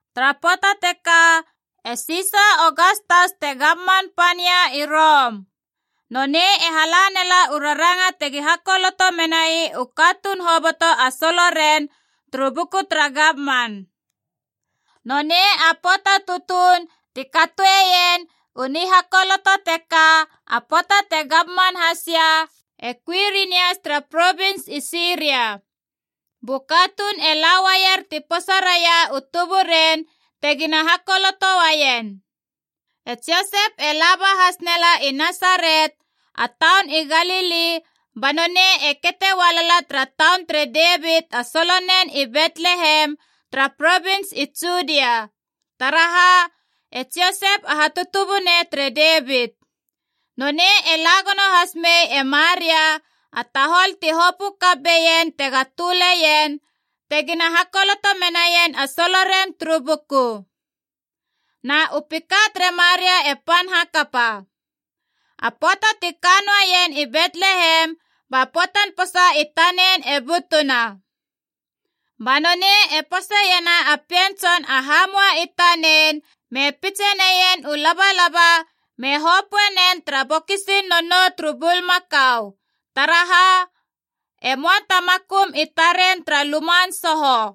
Tara pöata teka e Sisa Ogastas te gamman Pania i Rom. Nonei e hala nela u raranga tegi hakoloto menai u katuun hoboto a soloren turu buku tara gamman. Nonei a pöata tutuun ti katoeien u nihakoloto teka, a pöata te gamman hasia e Kuirinias tara provins i Siria. Bu katuun e la uaier ti posa raia u tuburen tegina hakoloto uaien. E Josep e laba has nela i Nasaret, a taun i Galili, ba nonei e kete ualala tara taun tere Devit a solonen i Betlehem tara provins i Judia. Taraha? E Josep a hatutubunei tere Devit. Nonei e la gono has mei e Maria, a tahol ti hopö kap beien tega töleien, tegina hakoloto menaien a soloren turu buku. Na u pika tere Maria e pan hakapa. A pöata ti ka noaien i Betlehem, ba pöatan posa i tanen e butuna. Ba nonei e poseiena a pien tson a hamua i tanen me pitse neien u labalaba me hopöe nen tara bokisin nonou turu bulmakau. Taraha? E möa ta makum i taren tara luman soho.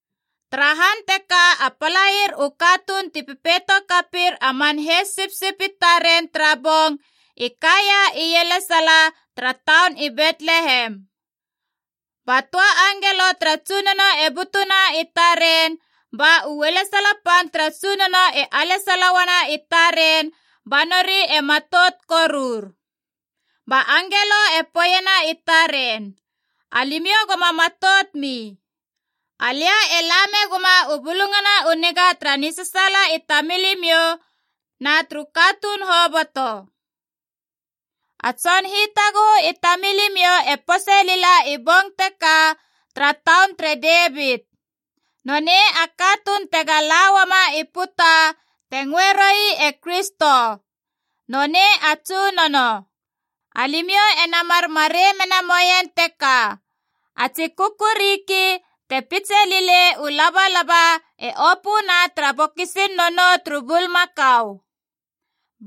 Tara han teka a palair u katuun ti pepeito kapir a man heis sipsip i taren tara bong, i kaia ielesala tara taun i Betlehem. Ba töa angelo tara Tsunono e butuna i taren, ba u ualesala pan tara Tsunono e alesala uana i taren ba nori e matout korur. Ba angelo e poeiena i taren, “Alimiou goma matout mi. Alia e la meguma u bulungana u niga tara nisasaala i tamilimiou na turu katuun hoboto. A Tson Hitaguhu i tamilimiou e pose lila i bong teka tara taun tere Devit. Nonei a katuun tega la uama i puta te ngöe roui e Kristo. Nonei a Tsunono! Alimiou ena mar marei mena moien teka, a tsi kukuriki te pitse lilei u labalaba, e opöna tara bokisin nonou turu bulmakau.”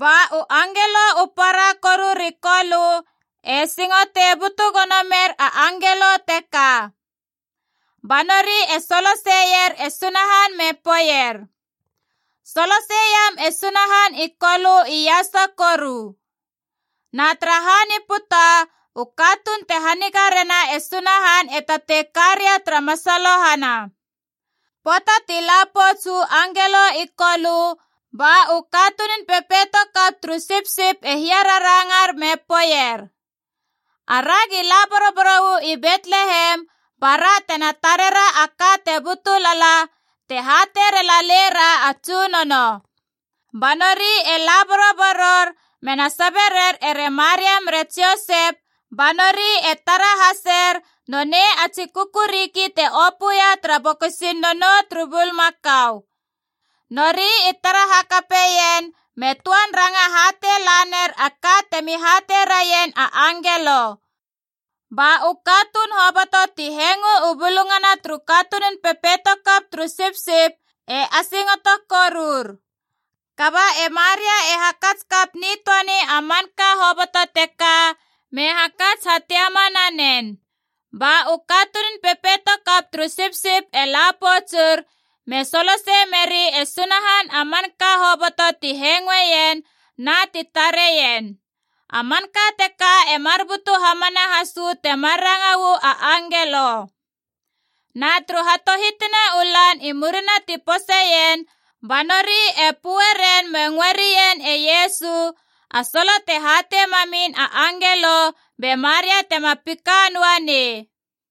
Ba u angelo u para koru ri Kolö e singotei butu gono mer a angelo teka. Ba nori e soloseier e Sunahan me poeier, “Solosei iam e Sunahan i Kolö iasa koru! Na tara han i puta, u katuun te haniga rena e Sunahan e tatei ka ria tara masalohana!” Pöata ti la pouts uu angelo i Kolö, ba u katunun pepeito kap turu sipsip e hiararangar me poeier, “Aragi la boroboro uu i Betlehem bara tena tarera a ka te butu lala, te hatei rela leira a Tsunono!” Ba nori e la boroboror mena sabe rer ere Maria mere Josep, ba nori e tara haser nonei a tsi kukuriki te opöia tara bokisin nonou turu bulmakau. Nori i tara hakapeien me töan ranga hatei laner a ka temi hatei raien a angelo. Ba u katuun hoboto ti hengo u bulungana turu katunun pepeito kap turu sipsip e asingoto korur. Kaba e Maria e hakats kap nitöani a manka hoboto teka me hakats hatiama nanen. Ba u katunun pepeito kap turu sipsip e la poutsur me solosei meri e Sunahan a manka hoboto ti hengoeien na ti tareien. A manka teka e mar butu hamana has uu temar ranga uu a angelo. Na turu hatohitina u lan i murina ti poseien, ba nori e pö ren me ngöe rien e Iesu, a solo te hatei mamin a angelo be Maria tema pika noanei.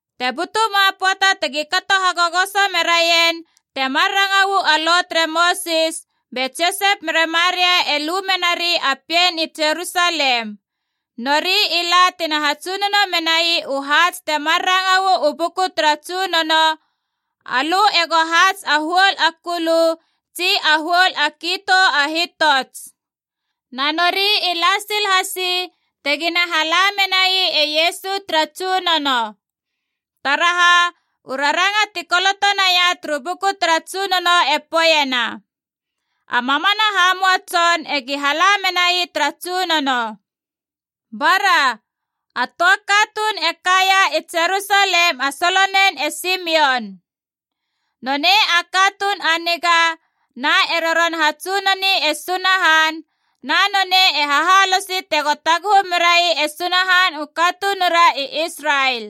Te butuma pöata tegi kato hagogoso meraien temar ranga uu a Lo tere Mosis, be Josep mere Maria e lu menari a pien i Jerusalem. Nori i la tina hatsunono menai u haats temar ranga uu buku tara Tsunono, “Alö ego haats a huol a kulu tsi a huol a kitou a hitots.” Na nori i la sil hasi te gina hala menai e Iesu tara Tsunono. Taraha? U raranga ti koloto naia turu buku tara Tsunono e poeiena, “A mamana hamua tson egi hala menai tara Tsunono.” Bara, a töa katuun e kaia i Jerusalem a solonen e Simion. Nonei a katuun a niga na e roron hatsunoni e Sunahan, na nonei e hahalosi tego taguhu merai e Sunahan u katunura i Israel.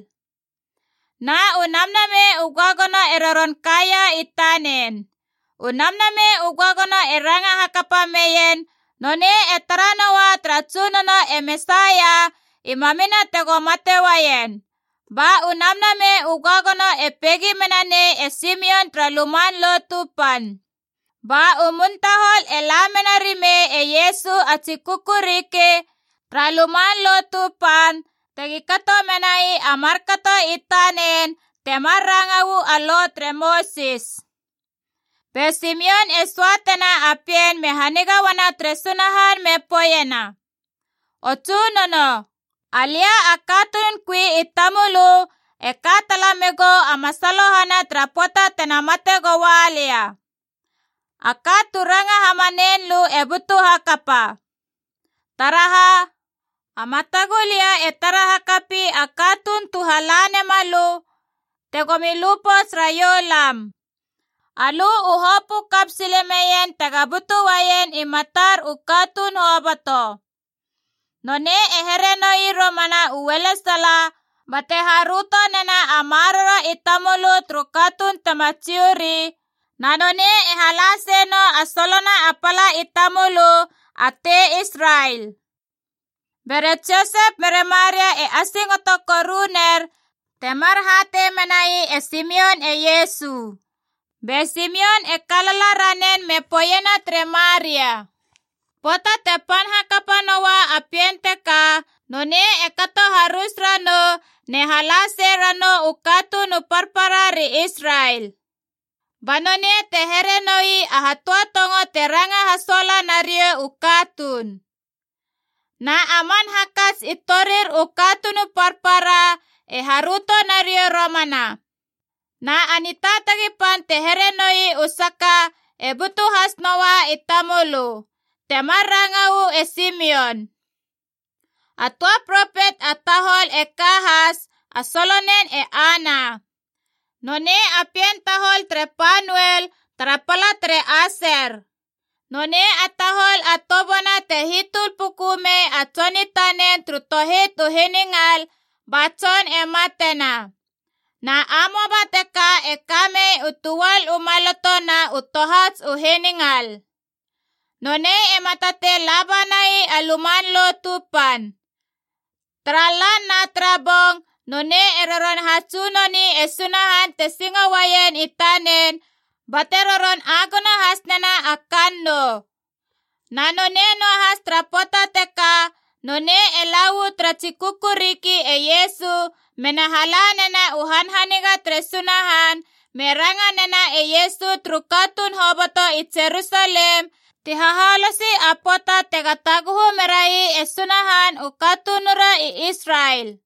Na u Namnamei u Göagono e roron kaia i tanen. U Namnamei u Göagono e ranga hakapa meien nonei e tara noua tara Tsunono e Mesaia i mamina tego mate uaien. Ba u Namnamei u Göagono e peigi mena nei e Simion tara Luman Lotu Pan. Ba u mun tahol e la mena rimei e Iesu a tsi kukuriki tara Luman Lotu Pan tegi kato menai a markato i tanen temar ranga uu a Lo tere Mosis. Be Simion e söatena a pien me haniga uana tere Sunahan me poeiena: “O Tsunono, alia a katunun kui i tamölö e ka tala megou a masalohana tara pöata tena mate goua lia. A ka tu ranga hamanein lö e butu hakapa. Taraha? A matagulia e tara hakapi a katuun tu hala nema lö tegomi lu pouts raiou lam. Alö u hopö kap silemeien tega butu uaien i matar u katuun hoboto. Nonei e here noi romana u ualesala, bate haröto nena a maroro i tamölö turu katuun tema Jiu ri, na nonei e hala seie nou a solona a pala i tamölö a tei Israel.” Bere Josep mere Maria e asingoto koruner temar hatei menai e Simion e Iesu. Be Simion e kalala ranen me poeiena tere Maria, “Pöata te pan hakapa noa a pien teka, nonei e kato harus ranou, ne hala sei ranou u katuun u parparaa ri Israel. Ba nonei te here noi a hatöatongo te ranga hasuala nariou u katuun. Na a man hakats i torir u katuun u parpara e haröto nariou romana. Na a nitaatagi pan te here noi u saka e butu has noua i tamölö!” Temar ranga uu e Simion. A töa propet a tahol e ka has, a solonen e Ana. Nonei a pien tahol tere Panuel, tara pala tere Aser. Nonei a tahol a toböana te hitöl puku mei a tson i tanen turu tohit u hiningal ba tson e matena. Na amoaba teka e ka mei u töal u maloto na u tohats u hiningal. Nonei ema tatei la banai a Luman Lotu Pan. Tara lan na tara bong nonei e roron hatsunoni e Sunahan te singo uaien i tanen bate roron agono has nena a kannou. Na nonei noahas tara pöata teka nonei e la uu tara tsi kukuriki e Iesu mena hala nena u hanhaniga tere Sunahan, me ranga nena e Iesu turu katuun hoboto i Jerusalem ti hahalosi a pöata tega taguhu merai e Sunahan u katunura i Israel.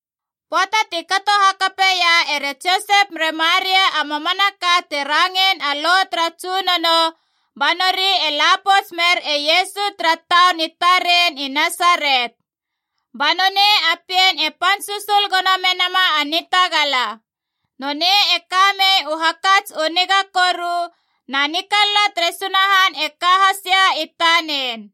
Pöata ti kato hakapeia ere Josep mere Maria a mamanaka te rangein a Lo tara Tsunono, ba nori e la pouts mer e Iesu tara taun i taren i Nasaret. Ba nonei a pien e pan susul gono menama a nitagala. Nonei e ka mei u hakats u niga koru, na nikalala tere Sunahan e ka hasia i tanen.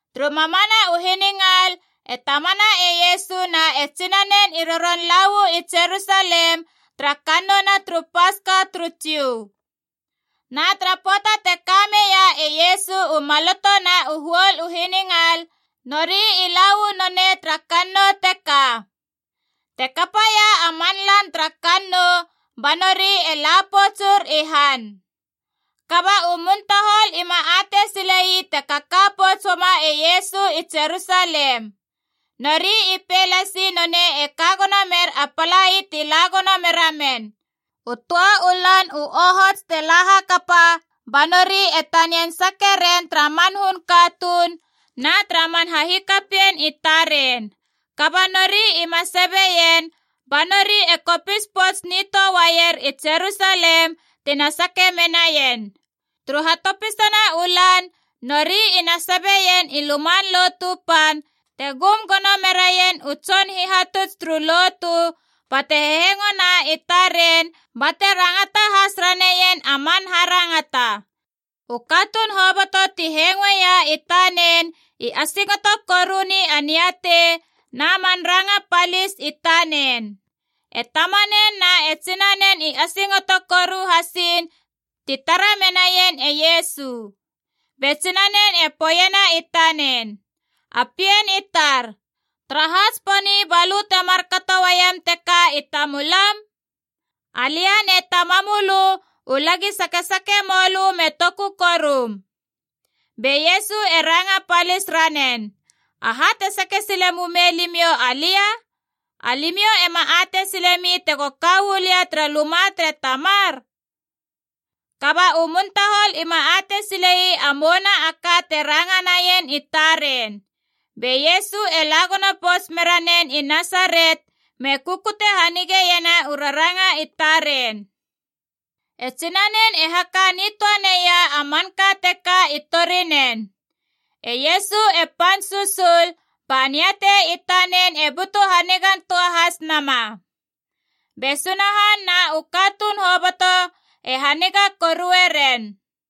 Turu mamana u hiningal e tamana e Iesu na e tsinanen i roron la uu i Jerusalem tara Kannouna turu Paska turu Jiu. Na tara pöata te ka meia e Iesu u maloto na u huol u hiningal, nori i la uu nonei tara kannou teka. Te kapaia a man lan tara kannou, ba nori e la poutsur i han.b Kaba u muntahol ima atei sile ii te kaka pouts uama e Iesu i Jerusalem. Nori i pei lasi nonei e ka gono mer a palai ti la gono meramen. U töa u lan u ohots ti la hakapa ba nori e tanian sake ren tara man hun katuun na tara man hahikapien i taren. Kaba nori ima sabeien, ba nori e kopis pouts nitöa uaier i Jerusalem tina sake menaien. Turu hatopisana u lan nori ina sabeien i Luman Lotu Pan, te gum gono meraien u tson hihatuts turu lotu, bate hehengona i taren bate rangata has raneien a man harangata. U katuun hoboto ti hengoia i tanen i asingoto koruni a niatei na man ranga palis i tanen. E tamanen na e tsinanen i asingoto koru hasiin ti tara menaien e Iesu. Be tsinanen e poeiena i tanen, “A pien i tar, taraha tsiponi balö te markato uaiem teka i tamulam? Alia ne tamamölö u lagi sakesake mölö me toku korum!” Be Iesu e ranga palis ranen, “Aha te sake sile mumei limiou alia? Alimiou ema atei silemi tego ka uu lia tara luma tere Tamar?” Kaba u muntahol ima atei sile ii a mouna a ka te ranga naien i taren. Be Iesu e la gono pouts mera nen i Nasaret me kukute hanigeiena u raranga i taren. E tsinanen e haka nitöa neia a manka teka i torinen. E Iesu e pan susul, ba niatei i tanen e butu hanigantöa has nama. Be Sunahan na u katuun hoboto e haniga korue ren.